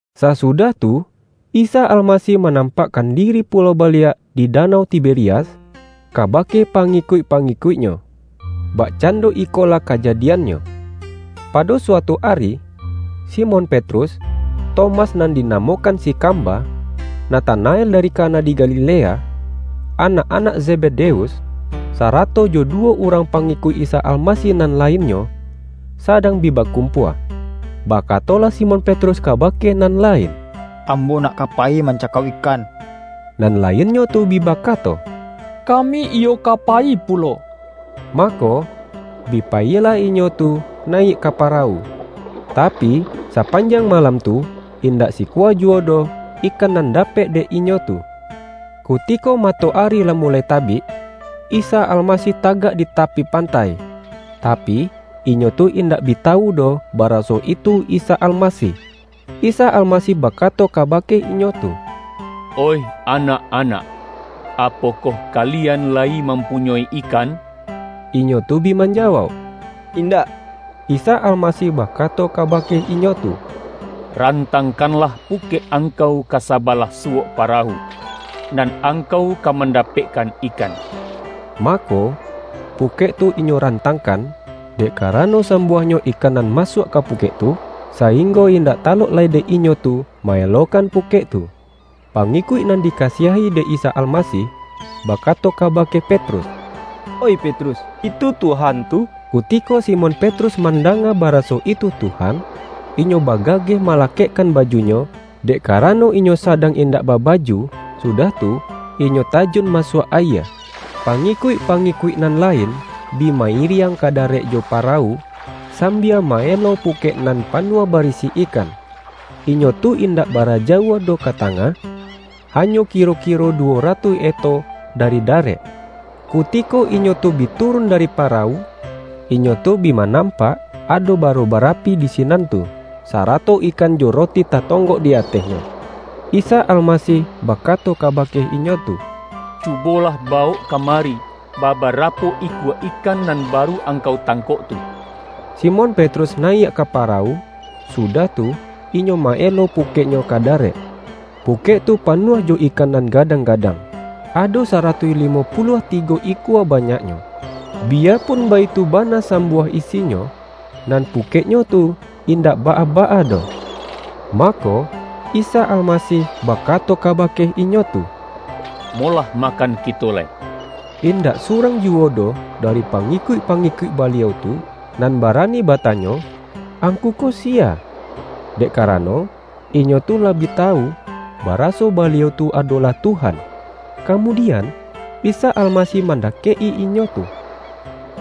Sasudah tu, Isa Almasih ma-nampakkan diri pulo baliak di danau Tiberias, kabake pangikuik-pa-ngikuik-Nyo. Bakcando ikolah kajadi-annyo: Pado suatu ari, Simon Petrus, Tomas nan dinamokan si Kamba, Na-tanael dari Kana di Galilea, anak-anak Zebedeus, sarato jo duwo urang pa-ngikuik Isa Almasih nan lainnyo, sa-dang bi bakumpua. Bakatolah Simon Petrus kabake nan lain,”Ambo nak ka payi mancakau ikan.” Nan lainnyo tu bi bakato,”Kami iyo ka payi pulo.” Mako, bi payilah inyo tu nayiak ka parawu. Tapi, sapanjang malam tu, indak sikua juwo doh ikan nan dapek dek inyo tu. Kutiko ma-toari lah muloi tabik, Isa Almasih ta-gak di tapi pantai, tapi, inyo tu indak bi tawu doh, baraso itu Isa Almasih. Isa Almasih bakato kabake inyo tu,”Oih anak-anak, apokoh kalian layi mampunyoi ikan?” Inyo tu bi manjawauk,”Indak.” Isa Almasih bakato kabake inyo tu,”Rantangkanlah pukek angkau ka sa-balah suwok parawu, nan angkau ka mandapekkan ikan.” Mako, pukek tu inyo rantangkan, dek karano sambuah-nyo ikan nan masuak ka pukek tu, sainggo indak talok lai dek inyo tu ma-elokan pukek tu. Pangikuik nan dikasiahi dek Isa Almasih, bakato kabake Petrus,”Oih Petrus, itu Tuhan tu!” Kutiko Simon Petrus mandanga baraso itu Tuhan, inyo bagageh malakekkan bajunyo (dek karano inyo sadang indak baba-ju) sudah tu, inyo tajun masuak ayie. Pangikuik-pangikuik nan lain bi ma-iriang ka darek jo parawu, sambia ma-elo pukek nan panuah barisi ikan. Inyo tu indak bara jauah doh ka tangah, ha-nyo kiro-kiro duwo ratuih eto dari da-rek. Kutiko inyo tu bi turun dari pa-rawu, inyo tu bi manampak ado baro barapi di sinan tu, sarato ikan jo roti tatonggok di atehnyo. Isa Almasih bakato kabake inyo tu,”Cubolah ba-wok kamari, babarapo ikua ikan nan baru angkau tangkok tu.” Simon Petrus nayiak ka parawu, sudah tu, inyo ma-elo pukeknyo ka darek. Pukek tu panuah jo ikan nan gadang-gadang; ado saratuih limo pu-luah tigo ikua banyaknyo. Biyapun baitu bana sambuah isinyo, nan pu-keknyo tu indak baa-baa doh. Mako, Isa Almasih bakato kabake inyo tu,”Molah makan kito lai.” Indak surang juwo doh dari pangikuik-pangikuik Ba-liau tu, nan barani batanyo,”Angku ko siya?” Dek karano, inyo tu lah bi tawu, baraso Baliau tu adolah Tuhan. Kamudian, Isa Almasih mandakek-i inyo tu,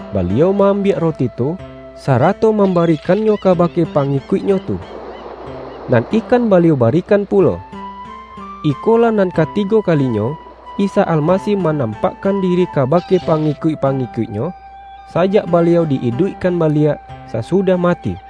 Baliau ma-ambiak roti tu, sa-rato mambarikannyo kabake pangi-kuik-Nyo tu. Nan ikan Baliau bari-kan pulo. Iko lah nan katigo kalinyo, Isa Al-masih manampakkan diri kabake pa-ngikuik-pangikuik-Nyo, sajak Baliau di-iduikkan baliak, sasudah mati.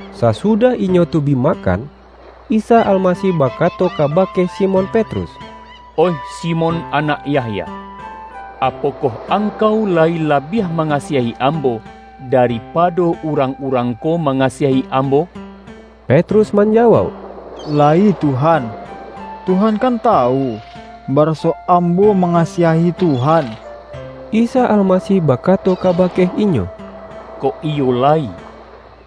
Sasudah inyo tu bi makan, Isa Almasih bakato kabake Simon Petrus,”Oih Simon anak Yahya, apokoh angkau layi labiah mangasiahi Ambo, da-ripado urang-urang ko mangasiahi Ambo?” Petrus manjawauk,”Layi Tuhan, Tuhan kan tawu, baraso ambo ma-ngasiahi Tuhan.” Isa Almasih bakato kabake inyo,”Kok iyo layi,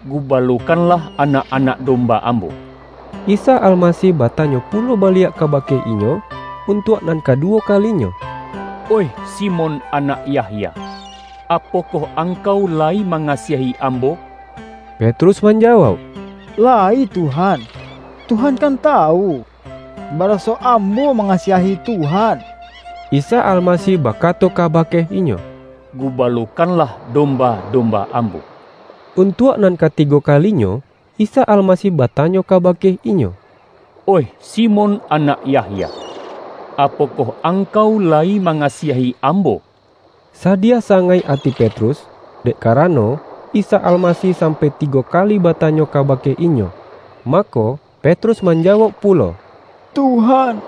gubalokanlah anak-anak dom-ba Ambo.” Isa Almasih batanyo pulo baliak kabake inyo, untuak nan kaduwo ka-linyo,”Oih Simon anak Yahya, apokoh angkau layi mangasiahi Ambo?” Petrus manjawauk,”Layi Tuhan, Tuhan kan tawu, baraso ambo ma-ngasiahi Tuhan.” Isa Almasih bakato kabake inyo,”Gu-balokanlah domba-domba Ambo.” Untuak nan katigo kalinyo, Isa Almasih batanyo kabake inyo,”Oih Si-mon anak Yahya, apokoh angkau layi mangasiahi Ambo?” Sadiah sangaik ati Petrus, dek ka-rano, Isa Almasih sampai tigo kali batanyo kabake inyo. Mako, Petrus manjawauk pulo,”Tuhan,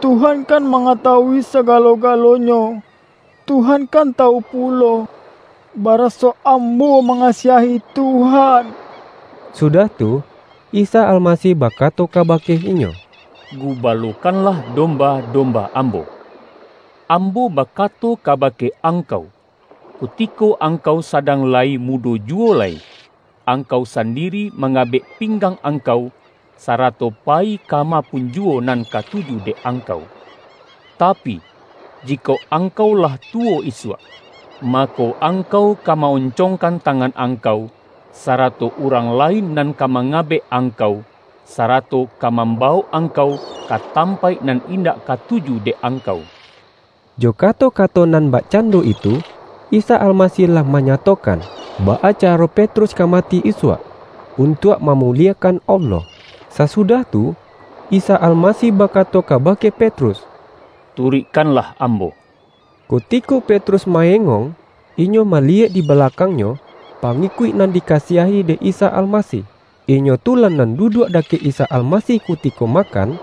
Tuhan kan mangatawui sagalo-galonyo. Tuhan kan tawu pulo, baraso ambo manga-siahi Tuhan!” Sudah tu, Isa Almasih bakato ka-bake inyo,”Gubalokanlah domba-domba Ambo. Ambo bakato ka-bake angkau: Kutiko angkau sadang layi mudo juwo lai, angkau sandiri mangabek pinggang angkau, sara-to payi kama pun juwo nan katuju dek angkau. Tapi, jikok angkau lah tuwo isuak, mako, angkau ka ma-oncongkan tangan angkau, sarato urang lain nan ka mangabek ang-kau, sarato ka mambawok angkau, ka tampaik nan indak katuju dek angkau.” Jo kato-kato nan bak-cando itu, Isa Almasih lah manyato-kan, baa caro Petrus ka mati isuak, untuak mamuliekan Allah. Sasudah tu, Isa Almasih bakato kabake Pet-rus,”Turuikkanlah Ambo!” Kutiko Petrus ma-engong, inyo maliyek di balakangnyo, pangikuik nan dikasiahi dek Isa Almasih. (Inyo tu lah nan duduak dakek Isa Almasih kutiko makan,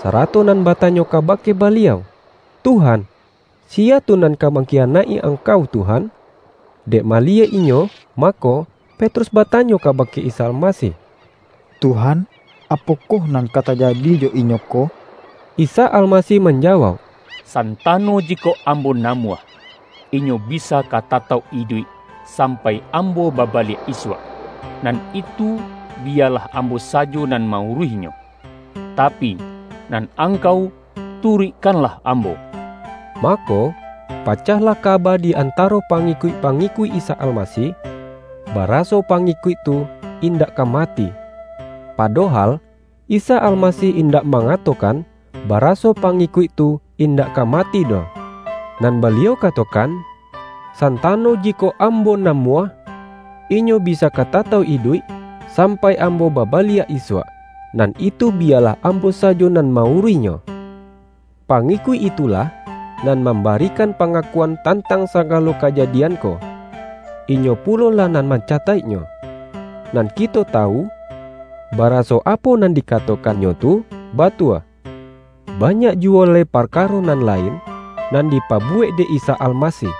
sarato nan batanyo kabake Baliau,”Tuhan, si-ya tu nan ka mangkiyanaik-i Ang-kau Tuhan?") Dek maliyek inyo, mako, Petrus batanyo kabake Isa Almasih,”Tuhan, apokoh nan ka ta-jadi jo inyo ko?” Isa Almasih manjawauk,”Santa-no jikok Ambo namuah, inyo bisa ka tatauk iduik, sampai Ambo babaliak isuak, nan itu biyalah Ambo sajo nan ma-uruihnyo. Tapi, nan angkau tu-ruikkanlah Ambo!” Mako, pacahlah kaba di antaro pangikuik-pangikuik Isa Almasih, ba-raso pangikuik tu indak ka mati. Pa-dohal, Isa Almasih indak mangato-kan, baraso pangikuik tu indak ka mati doh, nan Baliau katokan:”San-tano jikok Ambo namuah, inyo bisa ka tatauk iduik, sampai Ambo baba-liak isuak, nan itu biyalah Ambo sajo nan ma-uruihnyo.” Pangikuik itulah, nan mambari-kan pangakuan tantang sagalo kaja-dian ko. Inyo pulolah nan mancataik-nyo. Nan kito tawu, baraso apo nan dikatokannyo tu, batua. Banyak juwo lai parkaro nan la-in, nan dipabuwek dek Isa Almasih.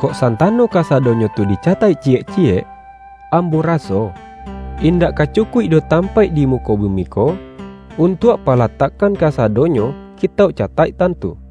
Kok santano kasadonyo tu dicataik ciyek ciyek, ambo raso, indak ka cu-kuik doh tampaik di muko bumi ko, untuak palatakkan kasadonyo kitauk cataiktan tu.